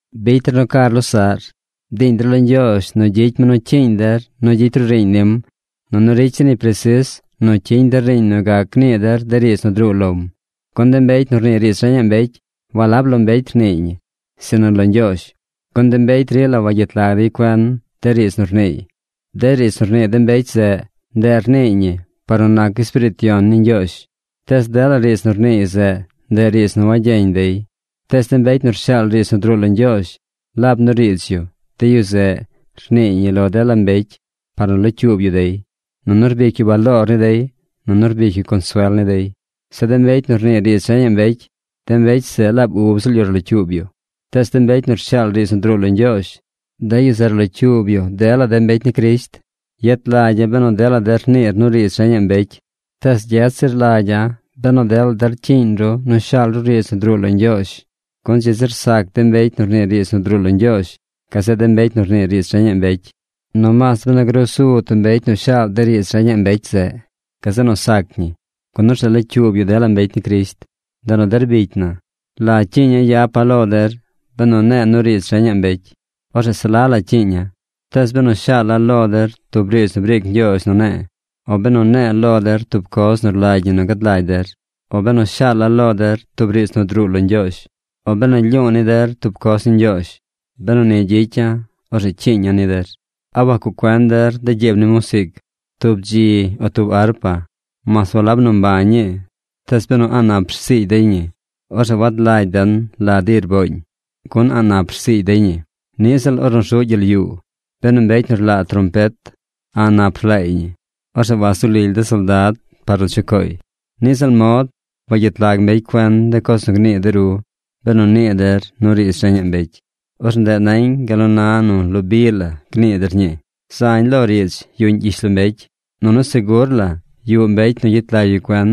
Bicy der nu car losaꞌr. Bdiiñ der lo Ñgyoozh nu gyicy mi nu cyiiñ der nu gyicy ru riiñ nim nunu ricy zir ñi presis nu cyiñ der riiñ nu gac gnii der de riidz nu druu lom. Gun de mbecy nu rnii riidz reñaꞌ mbecy, walab lo mbecy rniiy ñi, sinu lo Ñgyoozh, gun de mbecy rila wagyet lag dey cuen de riidz nu rniiy. De riidz nu rnii de mbecy zeꞌ, ndeꞌ rniiy ñi por nu nac Espiriit Yon ni Ñgyoozh, tees dela riidz nu rniiy zeꞌ, ndeꞌ riidz nu wagyeñ dey. Tees de mbecy nu rshaal riidz nu druu lo Ñgyoozh laab nu riidz yu, de yu zeꞌ, rniiy ñi lo dela mbecy par nu locyuub yu dey, nunu rbic yu baloor ni dey, nunu rbic yu consuel ni dey. Zeꞌ de mbecy nu rnii riidz reñaꞌ mbecy, de mbecy zeꞌ laab ub ziꞌl yu rlocyuub yu. Tees de mbecy nu rshaal riidz nu druu lo Ñgyoozh, de yu zeꞌ rlocyuub yu dela de mbecy ni Crisht. Yet lagya̱ benu dela der niir nu riidz reñaꞌ mbecy, tees gyet zir lagya̱ benu dela der cyiiñ ru nu shaal ru riidz nu druu lo Ñgyoozh. Gun dzi zir sac de mbecy nu rnii riidz nu druu lo Ñgyoozh gazeꞌ de mbecy nu rnii riidz reñaꞌ mbecy. Nomaas benu grusu tub mbecy nu shaal de riidz reñaꞌ mbecy zeꞌ, gazeꞌ nu sac ñi, gun orzeꞌ locyuub yu dela mbecy ni Crisht. Ndeꞌ nu der bicy na, ¿la cyiiña̱ yapa̱ lo der benu ne̱e̱ nu riidz reñaꞌ mbecy? Orzeꞌ se la la cyiiña̱. Tees benu shaala̱ lo der tub riidz nu briic Ñgyoozh nu ne̱e̱, o benu ne̱e̱ lo der tub coz nu rlagy ñi nu gad lagy der, o benu shaala̱ lo der tub riidz nu druu lo Ñgyoozh, o benu lyu̱u̱ ni der tub coz ni Ñgyoozh, benu ni gyicya̱, orzeꞌ cyiiña̱ ni der. ¿A wacuꞌ cuen der de gyiib ni musiic? Tub bdzi o tub arpa, mas walab nu mbañ ñii, tees benu a̱ꞌ nap rsiigy dey ñi, orzeꞌ wad lagy den la di rbooñ, gun a̱ꞌ nap rsiigy dey ñi. Niꞌ ziꞌl ornu rzuꞌ gyel yuu. Benu mbecy nu rlaa trompet a̱ꞌ nap rlaay ñi, orzeꞌ wazu lily de soldad par nu chucooy. Niꞌ ziꞌl mod wagyet lag mbecy cuen de coz nu gnii de ru, benu nii der nu riidz reñaꞌ mbecy. Orzeꞌ ndeꞌ nañ gal nu na nu lo bi la gnii der ñii. Zañ lo riidz yuꞌñ gyishlombecy, nunu segur la yuꞌ mbecy nu gyet lag yu cuen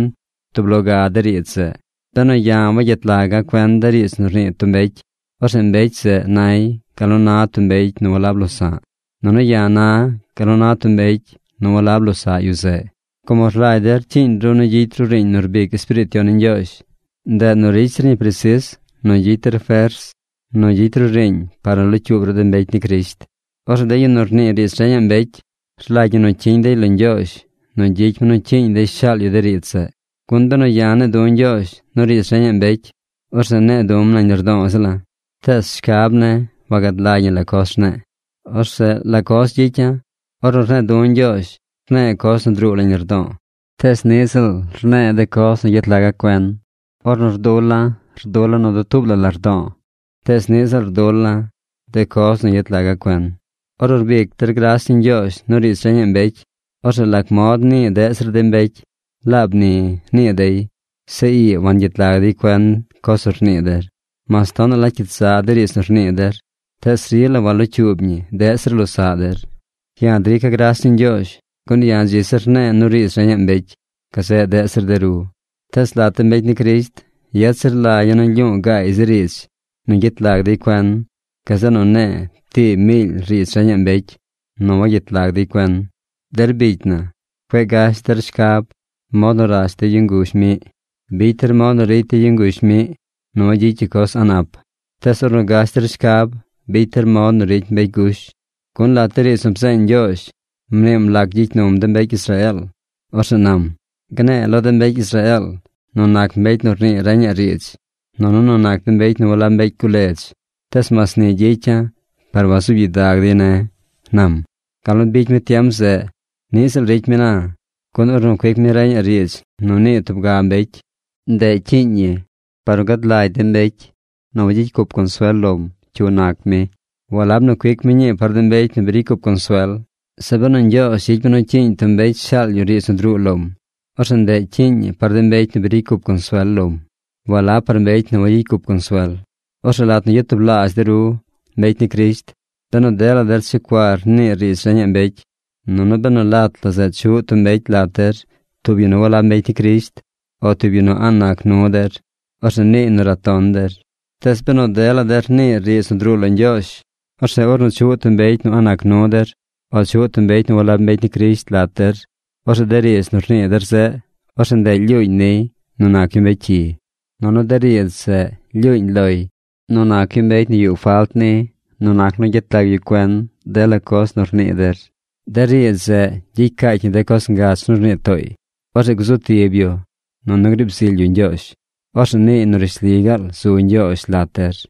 tub lo ga de riidz zeꞌ. Benu ya̱ wagyet laga̱ cuen de riidz nu rnii tub mbecy, orzeꞌ mbecy zeꞌ nay gal nu na tub mbecy nu walab losa̱ꞌ, nunu ya̱ na gal nu na tub mbecy nu walab losaꞌ yu zeꞌ. Como rlagy der cyiiñ ru nu gyicy ru riiñ nu rbic Espiriit Yon ni Ñgyoozh, ndeꞌ nu ricy zir ñi presis nu gyicy der fers nu gyicy ru riiñ par nu locyuub ru de mbecy ni Crisht. Orzeꞌ de yu nu rnii riidz reñaꞌ mbecy, rlagy ñi nu cyiñ dey lo Ñgyoozh nu gyicy mi nu cyiiñ dey shaal yu de riidz zeꞌ. Gun benu ya̱ ne̱e̱ du̱ Ñgyoozh nu riidz reñaꞌ mbecy, orzeꞌ ne̱e̱ du̱m nañ lardo̱o̱ ziꞌla̱. Tees shcab ne̱ wagad lagy ñi la coz rne̱e̱. Orzeꞌ ¿la coz gyicya̱? Ornu rne̱e̱ du̱ Ñgyoozh, rne̱e̱ coz nu druu nañ lardo̱o̱, tees niꞌ ziꞌl rne̱e̱ de coz nu yet laga̱ cuen. Ornu rdula̱, rdula̱ nu dutuub la lardo̱o̱, tees niꞌ ziꞌl rdula̱ de coz nu yet laga̱ cuen. Ornu rbic der gras ni Ñgyoozh nu riidz reñaꞌ mbecy, orzeꞌ ¿lac mod nii deꞌ zir de mbecy: “Laab ni”, nii dey? Zeꞌ ii wangyet lag dey cuen coz nu rnii der. Mas tonaꞌ la cyit za de riidz nu rnii der, tees rila walocyuub ñi deꞌ zir losaꞌ der. Ya̱ drica̱ gras ni Ñgyoozh, gun ya̱ dzi zir rne̱e̱ nu riidz reñaꞌ mbecy gazeꞌ deꞌ zir de ru. Tees lat de mbecy ni Crisht, yet zir lagya̱ nu lyu̱u̱ gaay zi riidz nu gyet lag dey cuen gazeꞌ nu ne̱e̱ tii miily riidz reñaꞌ mbecy nu wagyet lag dey cuen. Der bicy na, cueꞌ gash der shcab mod nu rash de yu nguzh miꞌ. Bicy der mod nu ricy de yu nguzh miꞌ nu wagyicy yu coz a̱ꞌ nap. Tees ornu gash der shcab, bicy der mod nu ricy mbecy gush. Gun lat de riidz nu bzeeñ Ñgyoozh mniim lac gyicy num de mbecy Israeel. Orzeꞌ nam: “Gne̱e̱ lo de mbecy Israeel nu nac mbecy nu rnii reñaꞌ riidz, nunu nu nac de mbecy nu walab mbecy guledz. Tees mas ni gyicya̱ par wazuub gyidag dey ne̱”, nam. Gal nu bicy mi tiem zeꞌ, niꞌ ziꞌl ricy mi na, gun ornu cuic mi reñaꞌ riidz nu nii tub ga mbecy, ndeꞌ cyiiñ ñi par nu gad lagy de mbecy nu wagyicy cup consuel lom cyu nac mi. Walab nu cuic mi ñii par de mbecy nu bi ricy cup consuel. Zeꞌ benu Ñgyoozh gyicy mi nu cyiiñ tub mbecy shaal yu riidz nu druu lom, orzeꞌ ndeꞌ cyiiñ ñi par de mbecy nu bi ricy cup consuel lom. Walab par mbecy nu wagyicy cup consuel. Orzeꞌ lat nu yatublaazh de ru, mbecy ni Crisht, benu dela der checuar niir riidz reñaꞌ mbecy, nunu benu lat la zeꞌ chuꞌ tub mbecy lat der, tub yu nu walab mbecy ni Crisht o tub yu nu a̱ꞌ nac nu der, orzeꞌ niiy nu raton der. Tees benu dela der niir riidz nu druu lo Ñgyoozh, orzeꞌ ornu chuꞌ tub mbecy nu a̱ꞌ nac nu der o chuꞌ tub mbecy nu walab mbecy ni Crisht lat der, orzeꞌ de riidz nu rnii der zeꞌ, orzeꞌ ndeꞌ lyuuñ niy nu nac yu mbecy cyi. Nunu de riidz zeꞌ lyuuñ loy nu nac yu mbecy nu yuꞌ falt ni nu nac nu gyet lag yu cuen dela coz nu rnii der. De riidz zeꞌ gyicy caacy ñi de coz ngach nu rnii tooy. Orzeꞌ gzu tib yu, nunu griib zily yu Ñgyoozh. Orzeꞌ niiy nu rishli gaal zu Ñgyoozh lat der.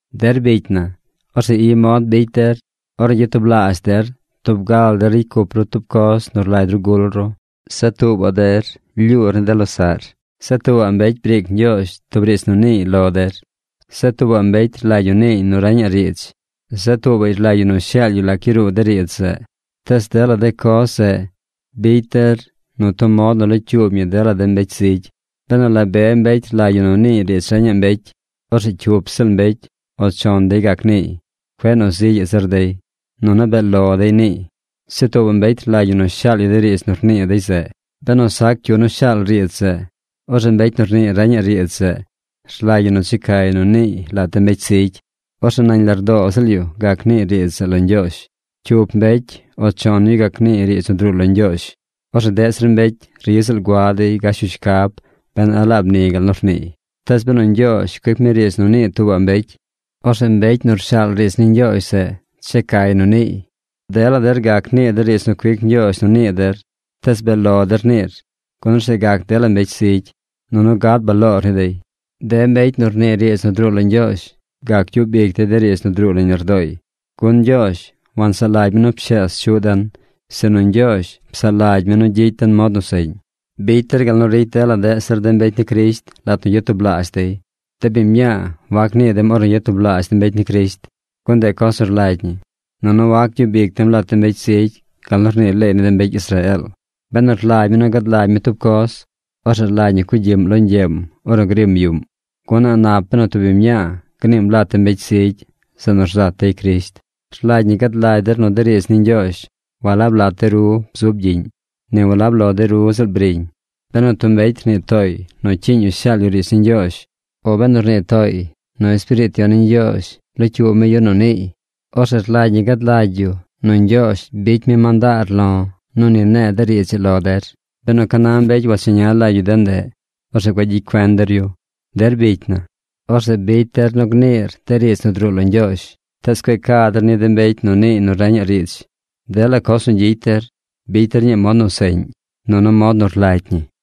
Der bicy na, orzeꞌ i mod bicy der: ornu gyatublaazh der, tub ga la der ricy cup ru tub coz nu rlagy ru gul ru. Zeꞌ tuubaꞌ der lyuur ni de losaꞌr. Zeꞌ tuubaꞌ mbecy briic Ñgyoozh tub riidz nu niiy lo der. Zeꞌ tuubaꞌ mbecy rlagy yu niiy nu reñaꞌ riidz. Zeꞌ tuubaꞌy rlagy yu nu shaal yu lac yaruu de riidz zeꞌ. Tees dela coz zeꞌ bicy der nu tub mod nu locyuub ñi dela de mbecy zigy. Benu la be mbecy rlagy yu nu niiy riidz reñaꞌ mbecy, orzeꞌ cyup ziꞌl mbecy o chon dey gac niiy. Cueꞌ nu zigyaꞌ zir dey. Nunu bee lo dey niiy. Zeꞌ tuubaꞌ mbecy rlagy ñi nu shaal yu de riidz nu rnii dey zeꞌ. Benu sac cyu nu shaal riidz zeꞌ, orzeꞌ mbecy nu rnii reñaꞌ riidz zeꞌ rlagy ñi nu checay nu niiy lat de mbecy zigy. Orzeꞌ nañ lardoo ziꞌl yu gac niiy riidz zeꞌ lo Ñgyoozh. Cyup mbecy o chon yu gac niiy riidz nu druu lo Ñgyoozh. Orzeꞌ deꞌ zir mbecy ri ziꞌl gua dey gash yu shcab ben a laab ni gal nu rniiy. Tees benu Ñgyoozh cuic mi riidz nu nii tuubaꞌ mbecy, orzeꞌ mbecy nu rshaal riidz ni Ñgyoozh zeꞌ checay nu rniiy. Dela der gac nii der riidz nu cuic Ñgyoozh nu nii der, tees bee lo der niir, gun orzeꞌ gac dela mbecy zigy, nunu gad baloor ni dey. De mbecy nu rnii riidz nu druu lo Ñgyoozh gac gyub ic dey de riidz nu druu nañ lardooy. Gun Ñgyoozh wansaꞌ lagy mi nu pshees chuꞌ den, sinu Ñgyoozh psaꞌ lagy mi nu gyicy den mod nu seꞌñ. Bicy der gal nu ricy dela deꞌ zir de mbecy ni Crisht lat nu yatublaazh dey. De biñ mñaa wac nii dem ornu yatublaazh de mbecy ni Crisht, gun ndeꞌ coz nu rlagy ñi. Nunu wac gyub ic dem lat de mbecy zigy gal nu rnii leey ni de mbecy Israeel. Benu rlagy mi gad lagy mi tub coz, orzeꞌ rlagy ñi cugyiꞌm lo ñgyeem ornu grim yuꞌm, gun a̱ꞌ nap benu tub biñ mñaa gniim lat de mbecy zigy, zeꞌ nu rzat dey Crisht. Rlagy ñi gad lagy der nu de riidz ni Ñgyoozh walab lat de ru bzub gyiꞌñ; ni walab lo de ru ziꞌl briñ. Benu tub mbecy rnii tooy nu cyiiñ yu shaal yu riidz ni Ñgyoozh o benu rnii tooy nu Espiriit Yon ni Ñgyoozh locyuub mi yu nu niiy, orzeꞌ rlagy ñi gad lagy yu nu Ñgyoozh bicy mi mandaar lo̱ nu ni ne̱e̱ de riidz ii lo der. Benu ca na mbecy wacheña lagy yu de ndeꞌ, orzeꞌ cueꞌ gyicy cuen der yu. Der bicy na, orzeꞌ bicy der nu gniir de riidz nu druu lo Ñgyoozh, tees cueꞌ ca der ni de mbecy nu niiy nu reñaꞌ riidz. Dela coz nu gyicy der bicy der ñii mod nu seꞌñ, nunu mod nu rlagy ñi.